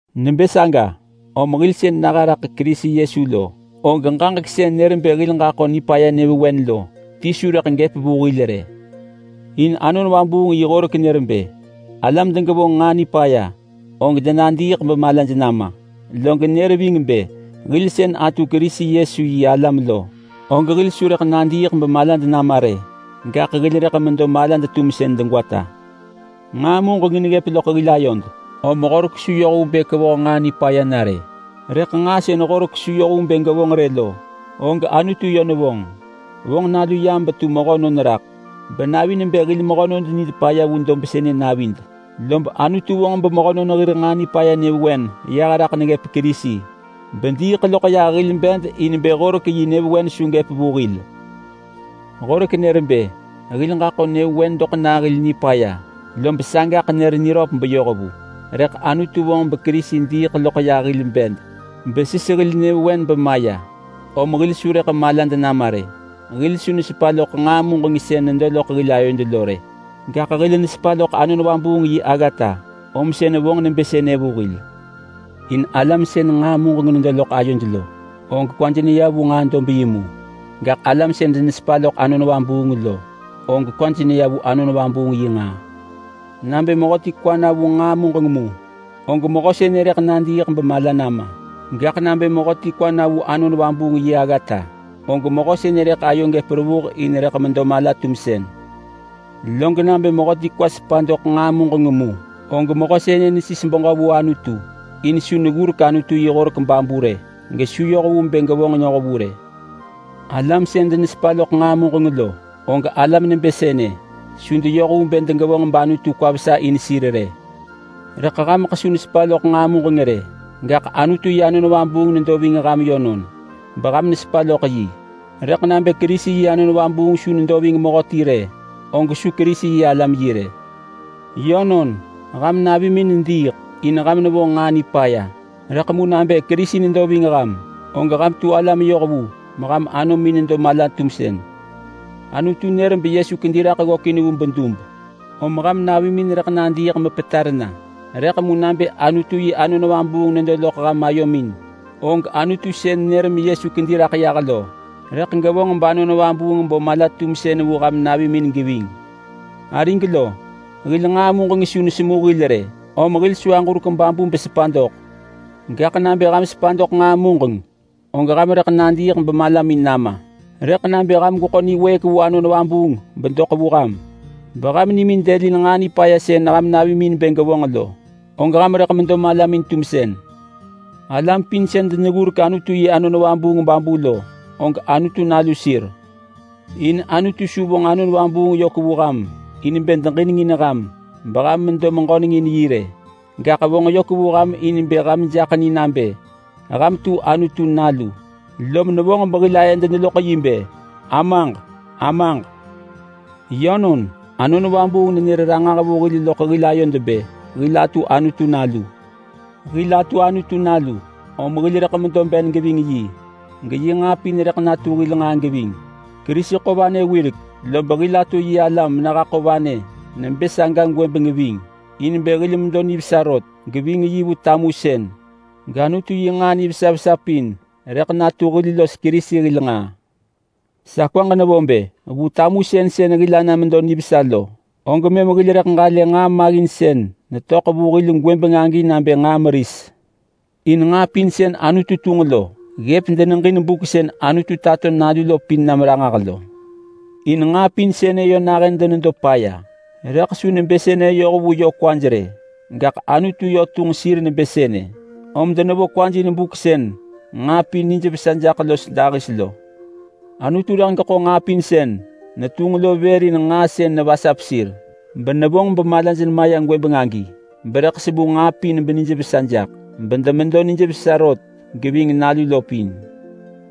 Nebë saga, om hil sën naha raḳ Kerisi Yesu lo, og ġaġek sën nër bë hil ġaḳo nipaya nyëvewen lo ti su rëḳ gëp vu hil rë. In Anon Vabuung yi horek nër bë alam degevonġ nġaa nipaya, og denadiiḳ bemalaj nama. Log nër ving bë hil atu Kerisi Yesu yi alam lo, og hil su rëḳ nadiiḳ bemalad nama rë, gaḳ hil rëḳ medo malad-tumsën degwata. Nġaa muġeng neggëp loḳ hil ayod, om Horek su yoh vu bë kevoh nġaa nipaya na rë. Rëḳ nġaa sën Horek su yoh vu bë gevonġ rë lo, og Anutu yö nevonġ. Vonġ nalu yam betu mehönon raḳ, benavi nebë hil mehönon nid paya vu dob sënë navid. Lob Anutu vonġ bemehönon hir nġaa nipaya nyëvewen yah raḳ neggëp Kerisi, bediiḳ loḳ yah hil bed in bë Horek yi nyëvewen su gëp vu hil. Horek nër bë hil ġaḳo nyëvewen doḳ nah hil nipaya, lob sagaḳ nër niröp beyoh vu. Rëḳ Anutu vonġ beKerisi diiḳ loḳ yah hil bed besis hil nyëvewen bemaya, om hil su rëḳ malad nama rë. Hil su nesepa loḳ nġaa muġeng sën nedo loḳ hil ayod lo rë, gaḳ hil nesepa loḳ Anon Vabuung yi aggata om sën vonġ nebë sënë vu hil. In alam sën nġaa muġeng nedo loḳ ayoj lo, og kwaj neya vu nġaa dob yi mu. Gaḳ alam sën denesepa loḳ Anon Vabuung lo, og kwaj neya vu Anon Vabuung yi nġaa. Nabë mehöti kwa na vu nġaa muġeng mu, og mehö sënë rëḳ nadiiḳ bemala nama. Gaḳ nabë mehöti kwa na vu Anon Vabuung yi aggata, og mehö sënë rëḳ ayo gëp revuh in rëḳ medo mala-tumsën. Log nabë mehöti kwa sepa doḳ nġaa muġeng mu, og mehö sënë nesis beġö vu Anutu. In su neggurek Anutu yi horek babu rë, gesu yoh vu bë gevonġ noh vu rë. Alam sën denesepa loḳ nġaa muġeng lo, og alam nebë sënë su deyoh vu bë degevonġ bAnutu kwa vesa in sir rë. Rëḳ hameḳ su nesepa loḳ nġaa muġeng rë. Gaḳ Anutu yi Anon Vabuung nedo ving ham yönon beham nesepa loḳ. Rëḳ nabë Kerisi yi Anon Vabuung su nedo ving mehöti rë, og su Kerisi-yi-alam yi rë. Yönon, ham navimin nediiḳ, in ham nevonġ nġaa nipaya, rëḳ mu nabë Kerisi nedo ving ham, og ham tu alam yohvu meham anomin nedo mala-tumsën. Anutu nër beYesu kedi raḳ ggökin vu bedub. Om ham navimin rëḳ nadiiḳ mepetar na rëḳ mu nabë Anutu yi Anon Vabuung nedo loḳ ham ayomin, og Anutu sën nër meYesu kedi raḳ yah lo rëḳ gevonġ bAnon Vabuung bo mala-tumsën vu ham navimin geving. Arig lo, hil nġaa muġeng su nesemu hil rë, om hil su aġurek babu besepa doḳ. Gaḳ nabë ham sepa doḳ nġaa muġeng, og ham rëḳ nadiiḳ bemalamin nama. Rëḳ nabë ham gweḳo niwëëk vu Anon Vabuung bedoḳ vu ham beham nimin dëlin nġaa nipaya sën ham navimin bë gevonġ lo, og ham rëḳ medo malamin-tumsën. Alam pin sën deneggurek Anutu yi Anon Vabuung babu lo, og Anutu nalu sir. In Anutu su vonġ Anon Vabuung yök vu ham in bë deġinengin ham beham medo meġöneng in yi rë. Gaḳ vonġ yök vu ham in bë ham jaḳ ni nabë ham tu Anutu nalu. Lom nevonġ behil ayed neloḳ yi bë, “Amaġ! Amaġ!” Yönon, Anon Vabuung nenër ranġah vu hil loḳ hil ayod bë hil atu Anutu nalu. Hil atu Anutu nalu, om hil rëḳ medo ben geving yi, geyi nġaa pin rëḳ natu hil nġaa geving. Kerisi ḳo vanë wirek, lob hil atu yi alam menehaḳo vanë nebë saga gwëbeng ving in bë hil medo nivesa rot geving yi vu tamusën, gAnutu yi nġaa nivesa vesa pin rëḳ natu hil los Kerisi hil nġaa. Sa kwaġ nevo bë vu tamusën sën hil ana medo nivesa lo, og mëm hil rëḳ ġalë nġaa maggin sën netöḳ vu hil gwëbeng agi nabë nġaa meris. In nġaa pin sën Anutu tunġ lo ggëp deneġin buk sën Anutu tato nalu lo pin nam ranġah lo. In nġaa pin sënë yö nahën denedo paya, rëḳ su nebë sënë yoh vu yö kwaj rë. Gaḳ Anutu yö tunġ sir nebë sënë, om denevo kwaj in buk sën nġaa pin nijvesa jaḳ los dahis lo. Anutu rëḳ geḳo nġaa pin sën netunġ lo vër in nġaa sën nevasap sir benevonġ bemalaj nema ya gwëbeng agi, berëḳ semu nġaa pin benijvesa jaḳ bedemedo nijvesa rot geving nalu lo pin.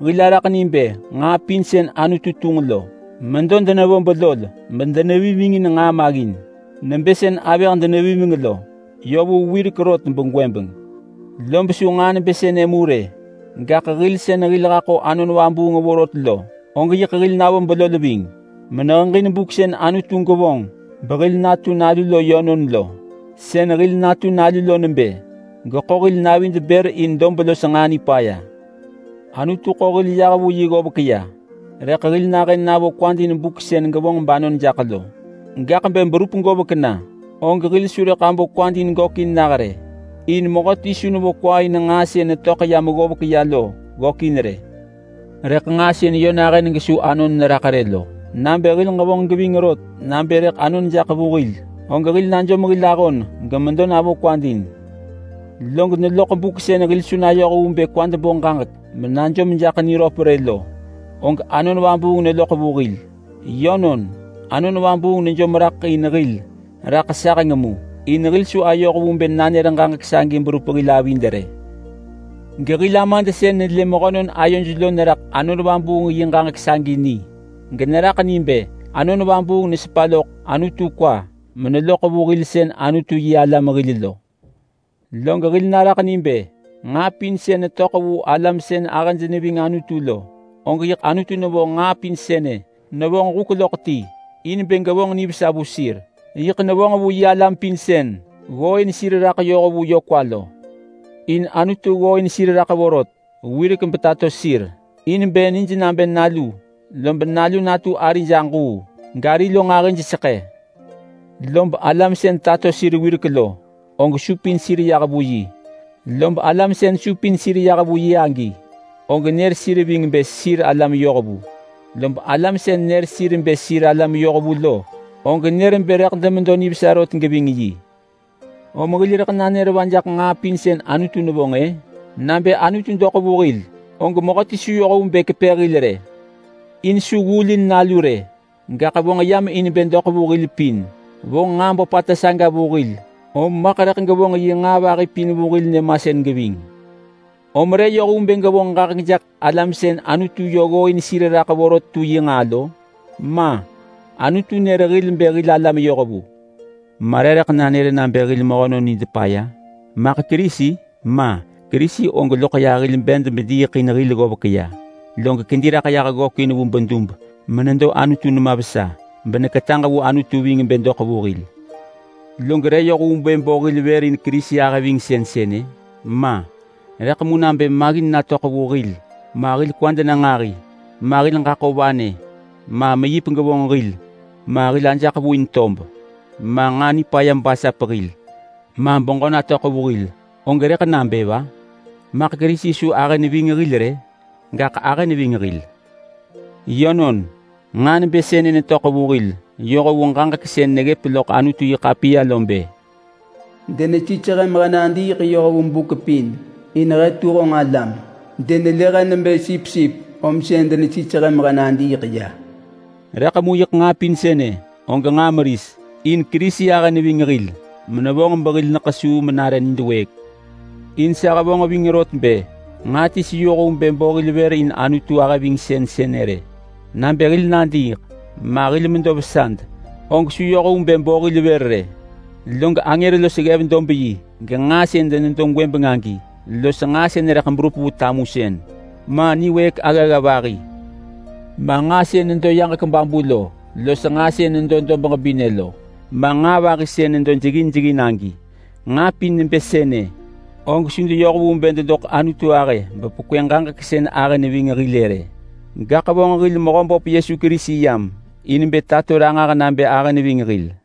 Hil araḳ ni bë nġaa pin sën Anutu tunġ lo medo denevo belol medenevimengin nġaa maggin, nebë sën avëh denevimeng lo, yö vu wirek rot begwëbeng. Lob su nġaa nebë sënë mu rë. Gaḳ hil sën hil haḳo Anon Vabuung vorot lo, og yiḳ hil navo belol ving meneheġin buk sën Anutu gevonġ behil natu nalu lo yönon lo. Sën hil natu nalu lo nebë: Geḳo hil navid bër vu dob los nġaa nipaya. Anutu ḳo hil yah vu yi ggovek ya, rëḳ hil nahën navo kwad in buk sën gevonġ banon jaḳ lo. Gaḳ bë berup govek na, og hil su rëḳ abo kwad in gökin nah rë, in mehöti su nevo kwa in nġaa sën netöḳ yam ggovek ya lo ggökin rë. Rëḳ nġaa sën yö nahën gesu anon neraḳ rë lo, nabë hil ġevonġ geving rot nabë rëḳ anon jaḳ vu hil, og hil najom hil ahon gemedo navo kwad in. Log neloḳ buk sën hil su nayoh vu bë kwad bo ġaġek menajom jaḳ niröp rë lo, og Anon Vabuung neloḳ vu hil. Yönon, Anon Vabuung nejom raḳ in hil raḳ saheng mu, in hil su ayoh vu bë nanër ġaġek sagi berup hil avid rë. Gehil Amad sën nelë mehönon ayoj lo neraḳ Anon Vabuung yi ġaġek sagi ni, generaḳ ni bë Anon Vabuung nesepa loḳ Anutu kwa meneloḳ vu hil sën Anutu-yi-alam hil lo. Log hil naraḳ ni bë nġaa pin sën netöḳ vu alam sën ahëj neving Anutu lo, og yiḳ Anutu nevonġ nġaa pin sënë nevonġ huk loḳ ti in bë gevonġ nivesa vu sir. Yiḳ nevonġ vu yi alam pin sën ggooin sir raḳ yoh vu yö kwa lo. In Anutu ggooin sir raḳ vorot wirek betato sir in bë nij nabë Nalu, lob Nalu natu arij aġuu, gari lo nġahiseḳë. Lob alam sën tato sir wirek lo, og supin sir yah vu yi. Lob alam sën supin sir yah vu yi agi, og nër sir ving bë sir alam yohvu. Lob alam sën nër sir bë sir alam yohvu lo, og nër bë rëḳ demedo nivesa rot geving yi. Om hil rëḳ nanër va jaḳ nġaa pin sën Anutu nevonġ-ë? Nabë Anutu doḳ vu hil, og mehöti su yoh vu bë kepë hil rë! In su ggulin Nalu rë, gaḳ vonġ yam in bë doḳ vu hil pin. Vonġ nġaa böpata saga vu hil, om maḳ rëḳ gevonġ yi nġaa vahi pin vu hil nyëmasën geving. Om re yoh vu bë gevonġ ġaġek jaḳ alam sën Anutu yö ggooin sir raḳ vorot tu yi nġaa lo? Ma! Anutu nër hil bë hil alam yohvu. Ma re rëḳ nanër nabë hil mehönon nid paya? Maḳ Kerisi? Ma! Kerisi og loḳ yah hil bed bediiḳ in hil ggovek ya. Log kedi raḳ yah ggökin vu bedub menedo Anutu nema vesa, beneketaġ vu Anutu ving bë doḳ vu hil. Log re yoh vu bë bo hil vër in Kerisi ahëvingsën sënë? Ma! Rëḳ mu nabë maggin natöḳ vu hil ma, nabë hil kwad na nġahi ma, nabë hil ġaḳo vanë, ma, nabë meyip gevonġ hil ma, nabë hil ajaḳ vu in tob ma, nġaa nipaya basap hil ma, beġö natöḳ vu hil, og rëḳ nabë va? Maḳ Kerisi su ahë neving hil rë? Gaḳ ahë neving hil! Yönon, nġaa nebë sënë netöḳ vu hil yoh vu ġaġek sën neggëp loḳ Anutu-yi-ḳapiya lo bë: “Denesis he mehe nadiiḳ yoh vu buk pin in he tu honġ alam. Denelë he nebë sipsip, om sën denesis he mehe nadiiḳ ya.” Rëḳ mu yiḳ nġaa pin sënë og nġaa meris. In Kerisi ahë neving hil menevonġ behil ḳesuu menare nid wëëk. In sa hevonġ ving rot bë nġaa ti su yoh vu bë bo hil vër in Anutu ahëvingsën sënë rë. Nabë hil nadiiḳ ma hil medo vesad, og su yoh vu bë bo hil vër rë. Log angër los ggev-dob-yi genġaa sën nedo gwëbeng agi los nġaa sën rëḳ berup vu tamusën ma, niwëëk aggagga vahi ma, nġaa sën nedo yaġek babu lo los nġaa sën nedo dob ġebinë lo, ma nġaa vahi sën nedo jeggin jeggin agi. Nġaa pin nebë sënë, og su deyoh vu bë dedoḳ Anutu ahë bepekwë ġaġek sën ahë neving hil-ë rë. Gaḳ vonġ hil Mehöböp Yesu Kerisi yam in bë tato ranġah nabë ahë neving hil.